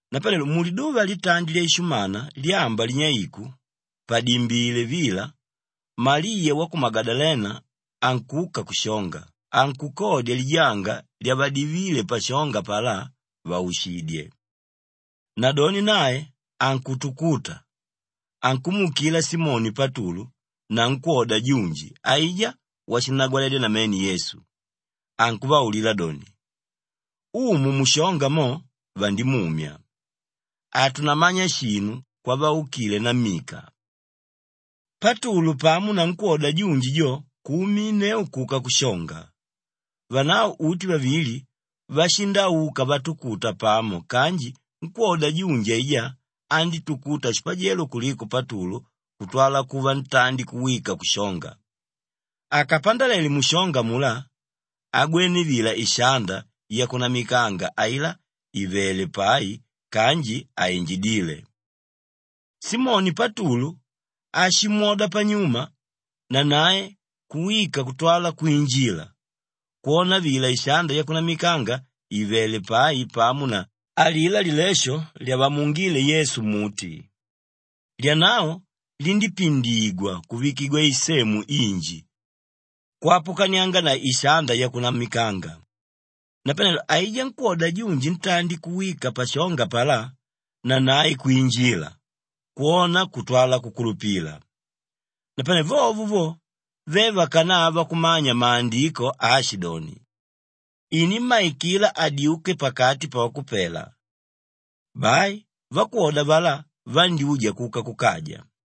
Napanelo muliduva litandi lyaishumana lyamba linyeiku padimbile vila, Maliya wa ku Magadalena ankuka kushonga, ankukodya lijanga lyavadivíle pashonga apalá, vàushidye. Nadoni nae ankutukuta, ankumuukila Simoni Patulu na nkwóda junji aijá washinnagwaledya namene Yesu, ankuvaulila doni, “Umu mushonga mo, vandimumya. Hatunamanya shinu kwavaukile nammika.” Patulu pamo na nkwóda junji jo kuuminneu kuka kushonga. Vanavo uti vavili vashindauka vatukuta pamo kanji nkwóda junji aijá andítukuta shipajelo kuliko Patulu kutwala kuva ntandi kuwika kushonga. Akapandalele mushonga amulá, agwené vila ishanda yakunamikanga ailá ìvele pai kanji hainjidíle. Simoni Patulu áshimwoda panyuma, nanae kuwika kutwala kwinjila, kwona vila ishanda yakunamikanga ìvele pai pamo na alilá lilesho lyavamuungíle Yesu mmuti. Lyanavo lindípindigwa kuvikigwa isemu inji kwapukanianga na ishanda yakunamikanga. Napanelo aijá nkwóda junji ntandi kuwika pashonga apalá, nanae kwinjila, kwona kutwala kukulupila. Napane vovo vo, ve vakanava kumanya Maandiko aashidoni, “Inímmaikila adyuke pakati pavakupela.” Bai vakwoda avalá vandyúja kuka kukaja.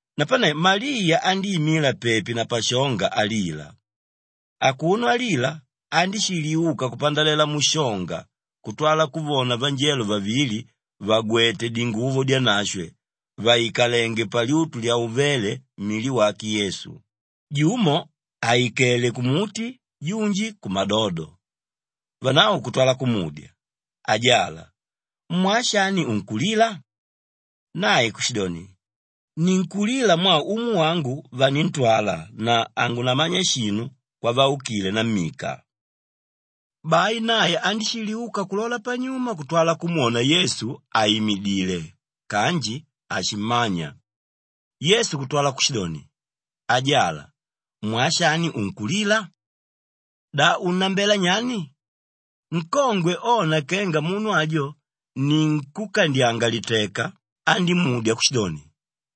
Napane Maliya andíimila pepi na pashonga alila. Akuno alila, andíshiliuka kupandalela mushonga kutwala kuvona vanjelo vavili vàgwete dinguvo dyanashwe, vàikalenge palyutu lyauvéle mili wake Yesu, jumo àikele kumuti, junji kumadodo. Vanavo kutwala kumudya, “Ajala, mwaa shani unkulila?” Nae kushidoni, “Ninkulila mwaa Umu wangu vanintwala na hangunamanya shinu kwavaukile nammika.” Bai nae andíshiliuka kulola panyuma kutwala kumwona Yesu àimidile kanji hashimmanya. Yesu kutwala kushidoni, “Ajala, mwaa shani unkulila? Da unnambela nyani?” Nkongwe ona kenga munu ajo ni nkúkandyanga liteka, andímudya kushidoni,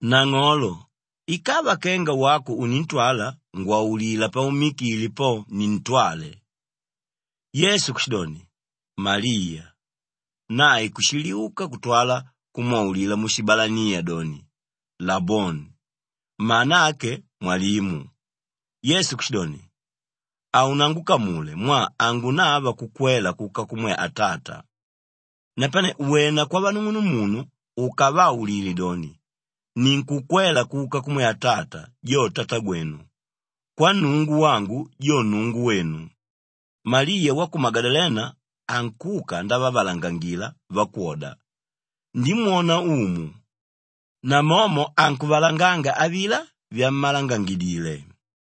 “Nang'olo, ikava kenga wako unintwala ngwaulila paummikile po, nintwale.” Yesu kushidoni, “Maliya!” Nae kushiliuka kutwala kumwaulila mushibalaniya doni, “Laboni,” mana ake Mwalimu. Yesu kushidoni, “Haunangukamule mwaa hangunava kukwela kuka kumwe Atata. Napane wena kwavanung'unumunu ukavaulile doni, ‘Ninkukwela kuka kumwe Atata, jo Tatagwenu; kwa Nnungu wangu, jo Nnungu wenu.’” Maliya wa ku Magadalena ankuka ndavavalangangila vakwoda, “Ndimwona Umu!” Namomo ankuvalanganga avilá vyamalangangidile.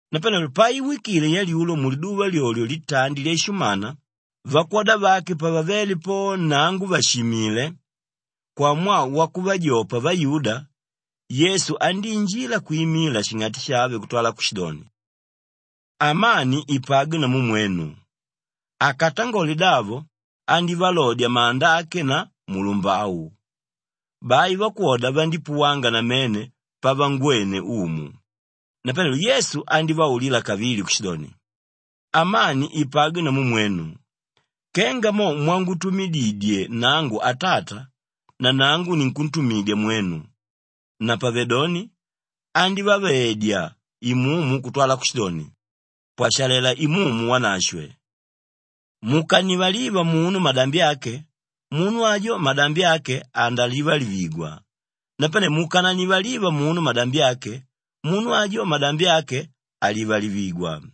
Napanelo paiwikile yalyulo muliduva lyolyo litandi lyaishumana, vakwoda vake pavavéle po nnango vàshimile kwamwaa wakuvajopa vayuda, Yesu andíinjila kwimila shing'ati shave kutwala kushidoni, “Amani ipagwe namu mwenu!” Akatangole davo andívalodya manda ake na mulumbau. Bai vakwoda vandípuwanga namene pavangwene Umu. Napanelo Yesu andívaulila kavili kushidoni, “Amani ipagwe namu mwenu! Kenga mo mwangutumidididye nangu Atata, nanangu ninkuntumidya mwenu.” Napavedoni, andívavaedya Imumu kutwala kushidoni, “Pwashalela Imumu Wanashwe! Mukannivaliva munu madambi ake, munu ajo madambi ake andalivalivigwa. Napane mukanannivaliva munu madambi ake, munu ajo madambi ake halivalivigwa.”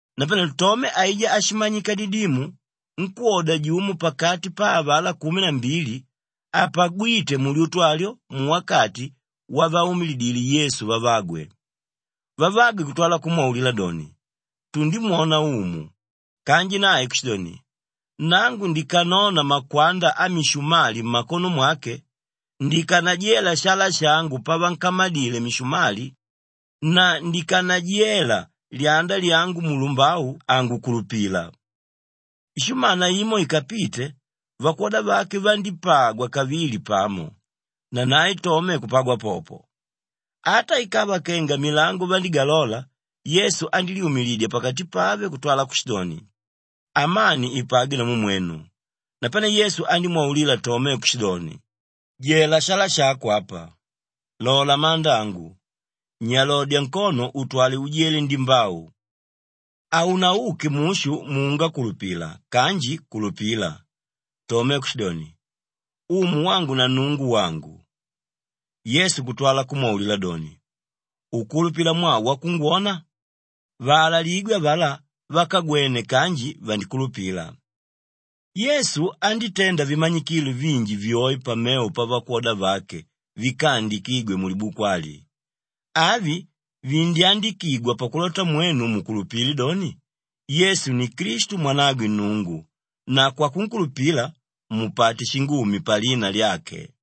Napanelo Tome aijá áshimanyika Didimu, nkwóda jumo pakati pa avalá kumi na mbili, hapagwíte mulyutu alyo muwakati wavaumilidíle Yesu vavagwe. Vavagwe kutwala kumwaulila doni, “Tundimwona Umu!” Kanji nae kushidoni, “Nangu ndikanona makwanda amishumali mmakono mwake, ndikanajela shala shangu pavankamadile mishumali na ndikanajela lyanda lyangu mulumbau, hangukulupila.” Ishumana imo ikapite, vakwoda vake vandípagwa kavili pamo; nanae Tome kupagwa popo. Ata ikava kenga milango vandígalola, Yesu andílyumilidya pakati pave kutwala kushidoni, “Amani ipagwe namu mwenu.” Napane Yesu andímwaulila Tome kushidoni, “Jela shala shako apa, lola manda angu. Nyalodya nkono utwale ujele ndimbau. Haunauke mushu muungakulupila kanji kulupila.” Tome kushidoni, “Umu wangu na Nnungu wangu!” Yesu kutwala kumwaulila doni, “Ukulupila mwaa wakungwona? Vaalaligwe avalá vákagwene kanji vandikulupila.” Yesu andítenda vimanyikilo vinji vyoe pamevo pavakwoda vake víkaandikigwe mulibuku ali. Avi vindyandikigwa pakulota mwenu mukulupile doni, Yesu ni Klistu Mwanagwe Nnungu na kwakunkulupila, mupate shingumi palina lyake.